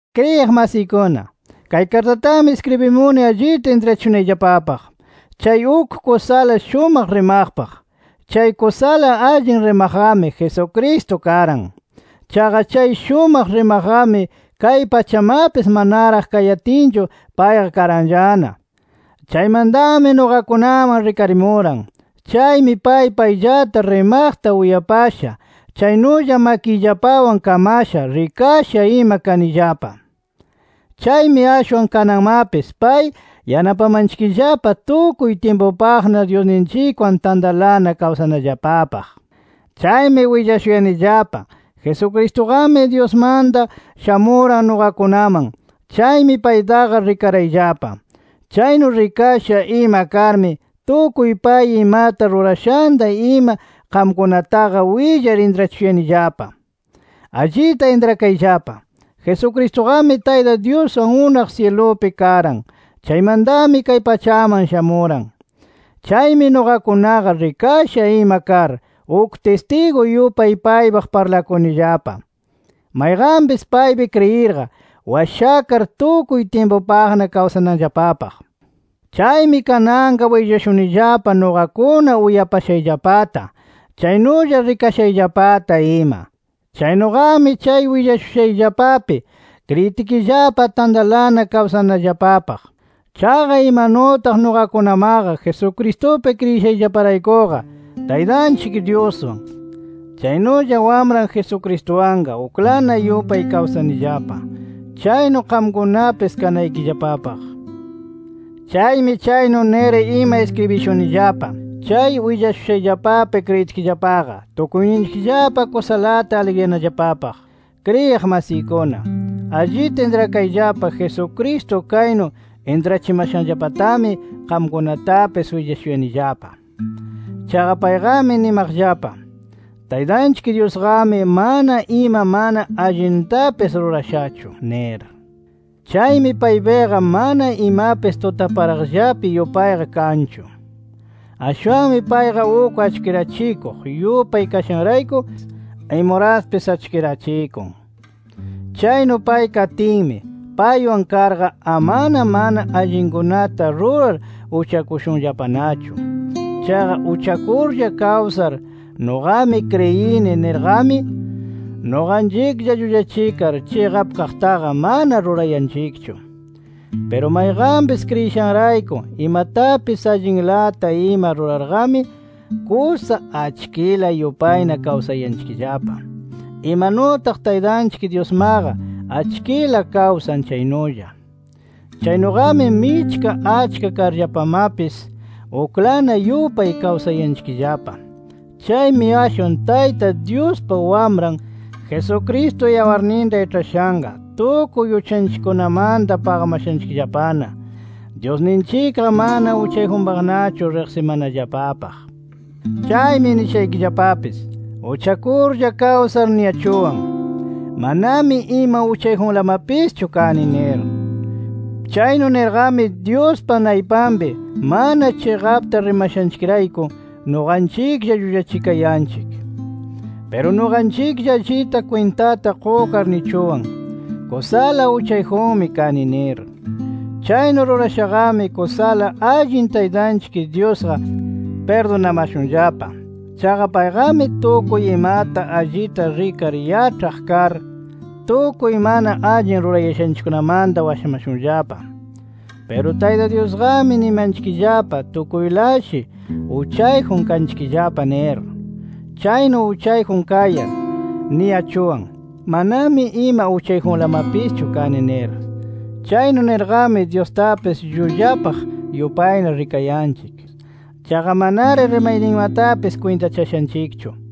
Kriyiq masiykuna, kay kartatami iskribimuni allita intrachishunayllapapaq chay uk kusala shumaq RIMAQPAQ. Chay kusala allin RIMAQQAMI Jesucristo karan. Chaqa chay shumaq RIMAQQAMI kay pachamapis manaraq kayatinchu payqa karanllana. Chaymantami nuqakunaman rikarimuran. Chaymi pay payllata rimaqta uyapasha, chaynulla makiyllapawan kamasha, rikasha ima kanillapa. Chaymi ashwan kananmapis pay yanapamanchikllapa tukuy tyimpupaqna Dyusninchikwan tantalana kawsanallapapaq. Chaymi willashuyanillapa, Jesucristuqami Dyusmanta shamuran nuqakunaman. Chaymi paytaqa rikarayllapa. Chaynu rikasha ima karmi, tukuy pay imata rurashanta ima qamkunataqa willar intrachishuyanillapa. Allita intrakayllapa, Jesucristuqami Tayta Dyuswan unaq syilupi karan. Chaymantami kay pachaman shamuran. Chaymi nuqakunaqa rikasha ima kar, uk tistigu yupay paypaq parlakunillapa, mayqanpis paypi kriyirqa washakar tukuy tyimpupaqna kawsananllapapaq. Chaymi kananqa willashunillapa nuqakuna uyapashayllapata, chaynulla rikashayllapata ima. Chaynuqami chay willashushayllapapi kriyitkillapa tantalana kawsanallapapaq. Chaqa imanutaq nuqakunamaqa Jesucristupi kriyishayllaparaykuqa, Taytanchik Dyuswan, chaynulla Wamran Jesucristuwanqa uklana yupay kawsanillapa, chaynu qamkunapis kanaykillapapaq. Chaymi chaynu nir ima iskribishunillapa, chay willashushayllapapi kriyitkillapaqa tukuyninchikllapa kusalata aligriyanallapapaq. Kriyiq masiykuna, allita intrakayllapa Jesucristo kaynu intrachimashanllapatami qamkunatapis willashuyanillapa. Chaqa payqami nimaqllapa: “Taytanchik Dyusqami mana ima mana allintapis rurashachu” nir. Chaymi paypiqa mana imapis tutaparaqllapi yupayqa kanchu. Ashwanmi payqa uk achkirachikuq yupay kashanrayku, imuraspis achkirachikun. Chaynu pay katinmi, paywan karqa, amana mana allinkunata rurar uchakushunllapanachu. Chaqa uchakurlla kawsar nuqami kriyini nirqami, nuqanchiklla llullachikar chiqap kaqtaqa mana rurayanchikchu. Piru mayqanpis kriyishanrayku imatapis allinlata ima rurarqami, kusa achkila yupayna kawsayanchikllapa, imanutaq Taytanchik Dyusmaqa achkila kawsan chaynulla. Chaynuqami, michka achka karllapamapis uklana yupay kawsayanchikllapa. Chaymi ashwan Tayta Dyuspa Wamran, Jesucristo yawarninta iĉhashanqa, tukuy uchanchikkunamanta paqamashanchikllapana, Dyusninchikqa mana uchayjunpaqnachu riqsimanallapapaq. Chaymi nishaykillapapis: Uchakurlla kawsar niyachuwan: Manami ima uchayjunlamapischu kani nir. Chaynu nirqami Dyuspa naypanpi mana chiqapta rimashanchikrayku, nuqanchiklla llullachikayanchik. Piru nuqanchiklla allita kwintata qukar nichuwan: Kusala uchayjunmi kani nir. Chaynu rurashaqami, kusala allin Taytanchik Dyusqa pirdunamashunllapa. Chaqa payqami tukuy imata allita rikar yaĉhaq kar, tukuy mana allin rurayashanchikkunamanta washamashunllapa. Piru Tayta Dyusqami nimanchikllapa tukuylashi uchayjun kanchikllapa nir. Chaynu uchayjun kayar, niyachuwan: Manami ima uchayjunlamapischu kani nir. Chaynu nirqami Dyustapis llullapaq yupayna rikayanchik. Chaqa manari rimayninmatapis kwintachashanchikchu.